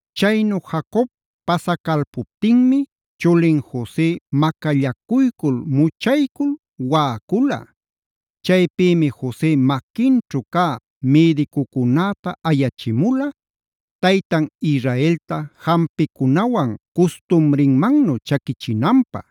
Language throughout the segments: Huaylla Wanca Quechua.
Chaynu Jacob pasacalpuptinmi chulin Jose macallacuycul, muchaycul waꞌacula. Chaypïmi Jose maquinćhu cä mïdicucunäta ayachimula, taytan Israelta jampicunawan custumrinmannu chaquichinanpä.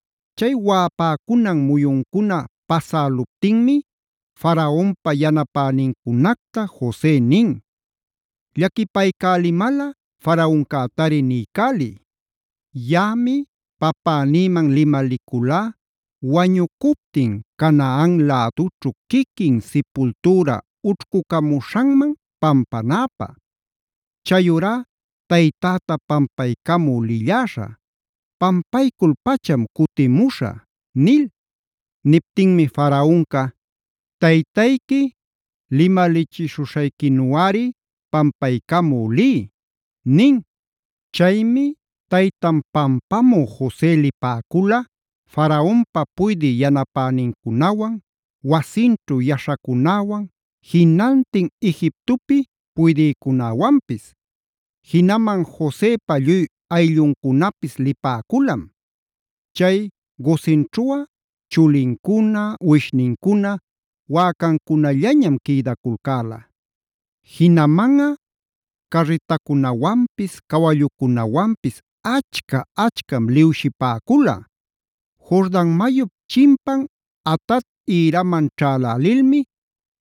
Chay waꞌapäcunan muyuncuna pasäluptinmi Faraonpa yanapänincunacta Jose nin: “Llaquipaycälimalꞌa Faraoncätari, niycäliy: Yaꞌami papänïman limaliculá wañucuptin Canaana lädućhu quiquin sipultüra ućhcucamuśhanman pampanäpä. Chayurá taytäta pampaycamü lilläśha; pampaycul-pacham cutimuśhä” nil. Niptinmi Faraonca: “Taytayqui limalichishuśhayquinuꞌari pampaycamü liy” nin. Chaymi taytan pampamü Jose lipäcula Faraonpa puydï yanapänincunawan, wasinćhu yaśhacunäwan, jinantin Egiptopi puydïcunäwanpis. Jinaman Josepa lluy aylluncunapis lipäculam. Chay Gosenćhuꞌa chulincuna, uwishnincuna, wäcancunallañam quïdaculcäla. Jinamanꞌa carritacunawanpis, cawallucunawanpis achca-achcam liwshipäcula. Jordan mayup chimpan Atad ïraman ćhälälilmi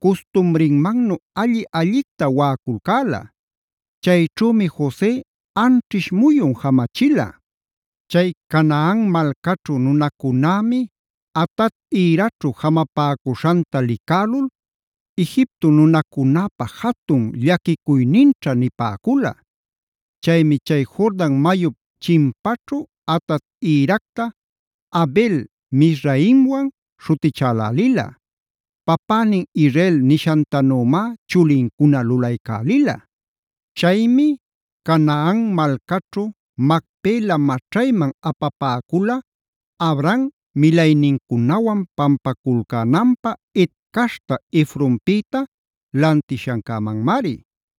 custumrinmannu alli-allicta waꞌaculcäla. Chayćhümi Jose anćhish muyun jamachila. Chay Canaan malcaćhu nunacunämi Atad ïraćhu jamapäcuśhanta licälul: “Egipto nunacunäpa jatun llaquicuyninćha” nipäcula. Chaymi chay Jordan mayup chimpaćhu Atad ïracta “Abel-mizraimwan” śhutichälälila. Papänin Israel nishantanümá chulincuna lulaycälila. Chaymi Canaan malcaćhu Macpela maćhayman apapäcula; Abraham milaynincunawan pampaculcänanpä Het caśhta Efronpïta lantishancämanmari.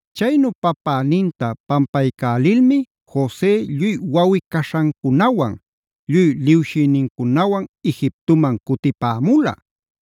Chaynu papäninta pampaycälilmi Jose lluy wawꞌi-caśhancunawan, lluy lïwshïnincunawan Egiptoman cutipämula.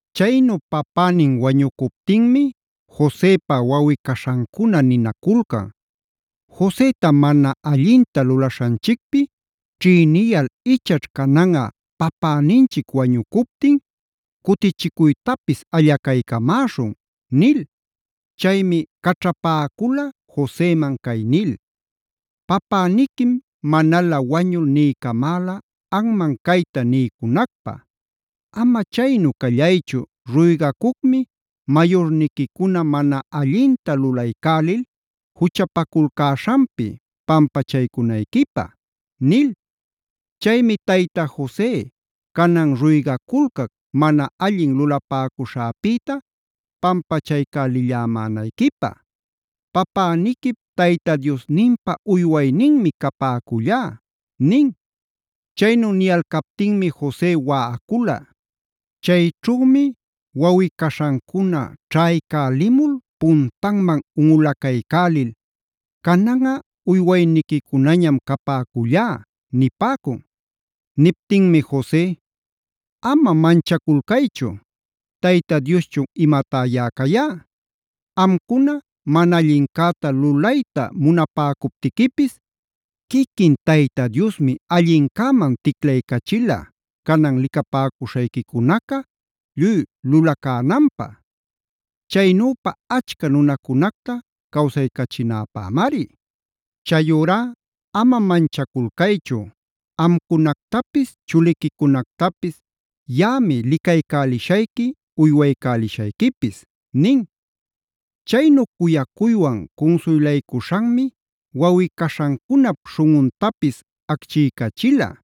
Chaynu papänin wañucuptinmi Josepa wawꞌi-caśhancuna ninaculcan: “Joseta mana allinta lulaśhanchicpi ćhïniyal ichaćh cananꞌa papäninchic wañucuptin cutichicuytapis allacaycamäśhun” nil. Chaymi caćhapäcula Joseman cay nil: “Papäniquim manalä wañul niycamäla anman cayta niycunacpä: ‘Ama chaynu callaychu ruygacucmi mayurniquicuna mana allinta lulaycälil juchapaculcäśhanpi pampachaycunayquipä’ nil. Chaymi tayta Jose, canan ruygaculcac mana allin lulapäcuśhäpïta pampachaycälillämänayquipä, papäniquip Tayta Diosninpa uywayninmi capäcullá” nin. Chaynu niyalcaptinmi Jose waꞌacula. Chayćhümi wawꞌi-caśhancuna ćhaycälimul puntanman unꞌulacaycälil: “Cananꞌa uywayniquicunañam capäcüllá” nipäcun. Niptinmi Jose: “Ama manchaculcaychu ¿Tayta Dioschun imatá yaꞌa cayá? Amcuna mana allincäta lulayta munapäcuptiquipis quiquin Tayta Diosmi allincäman ticlaycachila canan licapäcuśhayquicunaca lluy lulacänanpä. Chaynüpa achca nunacunacta cawsaycachinäpämari. Chayurá ama manchaculcaychu. Amcunactapis chuliquicunactapis yaꞌami licaycälishayqui uywaycälishayquipis” nin. Chaynu cuyacuywan cunsuylaycuśhanmi wawꞌi-caśhancunap śhunꞌuntapis acchiycachila.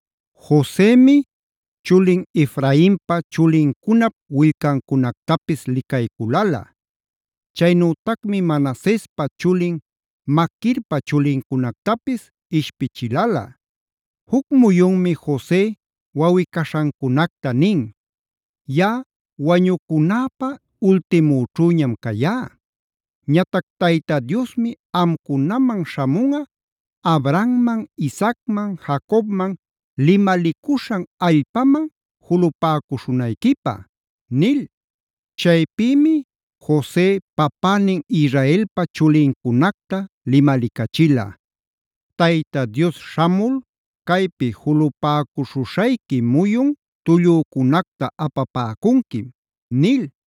Josemi chulin Efrainpa chulincunap willcancunactapis licayculala. Chaynütacmi Manasespa chulin Maquirpa chulincunactapis ishpichilala. Juc muyunmi Jose wawꞌi-caśhancunacta nin: “Yaꞌa wañücunäpä ultimüćhüñam cayá. Ñatac Tayta Diosmi amcunaman śhamunꞌa Abrahamman, Isaacman, Jacobman limalicuśhan allpaman julupäcuśhunayquipä” nil. Chaypïmi Jose papänin Israelpa chulincunacta limalicachila: “Tayta Dios śhamul caypi julupäcuśhuśhayqui muyun tullücunacta apapäcunquim”c nil.